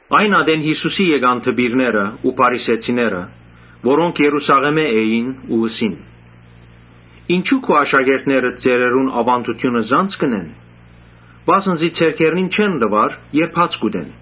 Այն ատեն Յիսուսի եկան դպիրները, փարիսեցիները, որոնք Երուսաղէմէն էին ու ըսին. «Ինչո՞ւ քու աշակերտներդ ծերերուն աւանդութիւնը զանց կ’ընեն, վասն զի ձեռքերնին չեն լուար, երբ հաց կ’ուտեն»։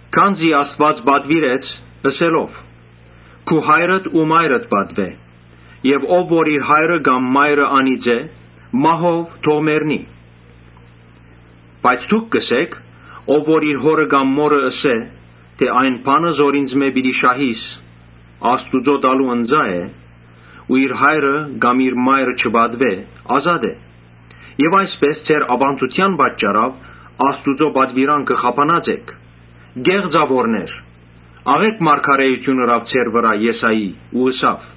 Քանզի Աստուած պատուիրեց ըսելով. ‘Քու հայրդ ու մայրդ պատուէ. Եւ ով որ իր հայրը կամ մայրը անիծէ, մահով թող մեռնի’։ Բայց դուք կ’ըսէք. ‘Ով որ իր հօրը կամ մօրը ըսէ թէ Այն բանը զոր ինծմէ պիտի շահիս, Աստուծոյ տալու ընծայ է ու իր հայրը կամ մայրը չպատուէ, ազատ է’։ Այսպէս ձեր աւանդութեան պատճառաւ Աստուծոյ պատուիրանքը խափանած էք։ Կե՛ղծաւորներ, աղէկ մարգարէութիւն ըրաւ ձեր վրայ Եսայի ու ըսաւ.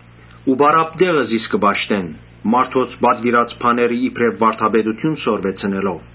Ու պարապ տեղը զիս կը պաշտեն՝ մարդոց պատուիրած բաները իբրեւ վարդապետութիւն սորվեցնելով’»։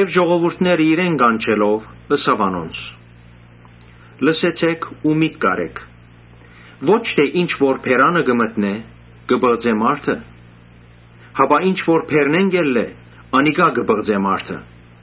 Ժողովուրդը իրեն կանչելով՝ ըսաւ անոնց. «Լսեցէք ու միտք առէք. Ոչ թէ ինչ որ բերանը կը մտնէ՝ կը պղծէ մարդը, հապա ինչ որ բերնէն կ’ելլէ՝ անիկա կը պղծէ մարդը»։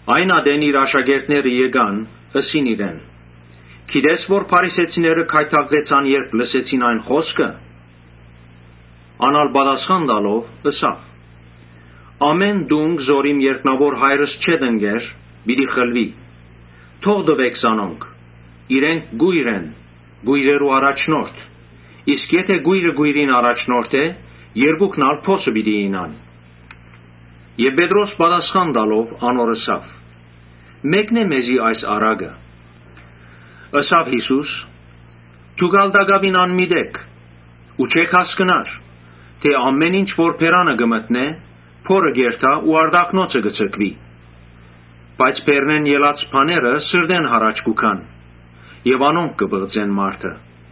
Այն ատեն իր աշակերտները եկան՝ ըսին իրեն. «Գիտե՞ս թէ փարիսեցիները գայթակղեցան, երբ լսեցին այն խօսքը»։ Ան ալ պատասխան տալով՝ ըսաւ. «Ամէն տունկ որ իմ երկնաւոր Հայրս չէ տնկեր, պիտի խլուի։ Թող տուէք զանոնք. իրենք կոյր են ու կոյրերու առաջնորդ։ Եթէ կոյրը կոյրին առաջնորդէ, երկուքն ալ փոսը պիտի իյնան»։ Պետրոս պատասխան տալով՝ անոր ըսաւ. «Մեկնէ մեզի այս առակը»։ Յիսուս ըսաւ. «Դո՞ւք ալ տակաւին անմիտ էք. Ու չէ՞ք հասկնար թէ ամէն ինչ որ բերանը կը մտնէ՝ փորը կ’երթայ ու արտաքնոցը կը ձգուի։ Իսկ բերնէն ելած բաները սրտէն յառաջ կու գան եւ անոնք կը պղծեն մարդը։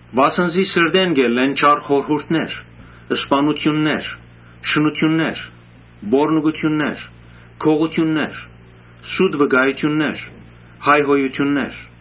Վասն զի սրտէն կ’ելլեն չար խորհուրդներ, սպաննութիւններ, շնութիւններ, պոռնկութիւններ, գողութիւններ, սուտ վկայութիւններ ու հայհոյութիւններ։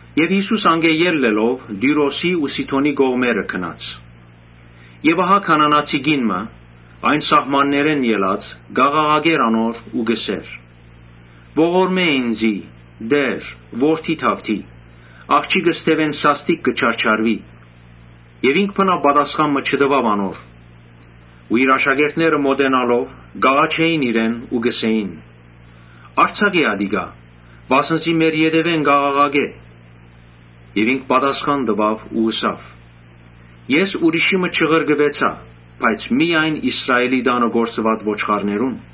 Յիսուս անկէ ելլելով՝ Տիւրոսի ու Սիդոնի կողմերը գնաց։ Քանանացի կին մը այն սահմաններէն ելած՝ կ’աղաղակէր անոր ու կ’ըսէր. «Ողորմէ ինծի, Տէ՛ր, Դաւիթի որդի, աղջիկս դեւէն սաստիկ կը չարչարուի»։ Ինք բնաւ պատասխան չտուաւ անոր։ Իր աշակերտները մօտենալով՝ կ’աղաչէին իրեն ու կ’ըսէին. «Արձակէ ատիկա, վասն զի մեր ետեւէն կ’աղաղակէ»։ Ինքն ալ պատասխան տուաւ ու ըսաւ. «Ես ուրիշի մը չղրկուեցայ, բայց միայն Իսրայէլի տանը կորսուած ոչխարներուն»։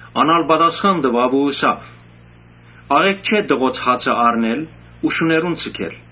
Ան ալ պատասխան տուաւ ու ըսաւ. «Աղէկ չէ տղոց հացը առնել ու շուներուն ձգել»։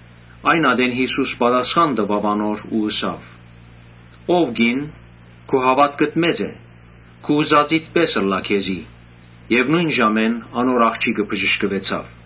Այն ատեն Յիսուս անոր ըսաւ. «Ո՛վ կին, քու հաւատքդ մեծ է, քու ուզածիդ պէս ըլլայ քեզի»։ Նոյն ժամուն անոր աղջիկը բժշկուեցաւ։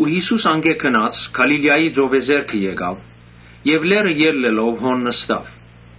Յիսուս անկէ գնաց, երբ Գալիլիայի ծովեզերքը հասաւ՝ լեռը ելլելով նստաւ։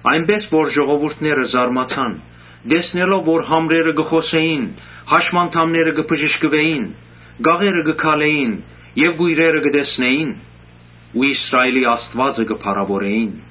Այնպէս որ ժողովուրդը զարմացաւ, տեսնելով որ համրերը կը խօսէին, հաշմանդամները կը բժշկուէին, կաղերը կը քալէին եւ կոյրերը կը տեսնէին ու Իսրայէլի Աստուածը կը փառաւորէին։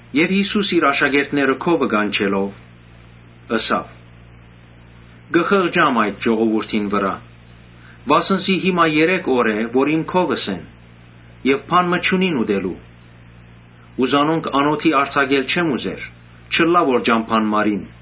Յիսուս իր աշակերտները քովը կանչելով՝ ըսաւ. «Կը խղճամ այդ ժողովուրդին վրայ, վասն զի երեք օր է, որ քովս են եւ բան մը չունին ուտելու։ Զանոնք անօթի արձակել չեմ ուզեր, չըլլայ որ ճամբան մարին»։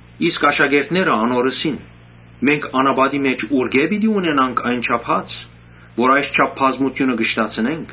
Աշակերտները անոր ըսին. «Մենք անապատին մէջ ուրկէ՞ պիտի ունենանք այնչափ հաց, որ այսչափ բազմութիւնը կշտացնեն»։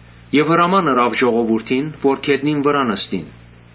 Հրաման ըրաւ ժողովուրդին որ գետնին վրայ նստին։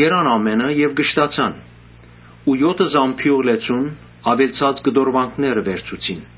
Կերան ամէնքը եւ կշտացան։ Եօթը զամբիւղ լեցուն՝ աւելցած կտորուանքներ վերցուցին։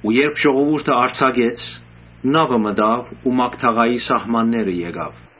Երբ ժողովուրդը արձակեց, նաւը մտաւ ու Մագդաղայի սահմանները գնաց։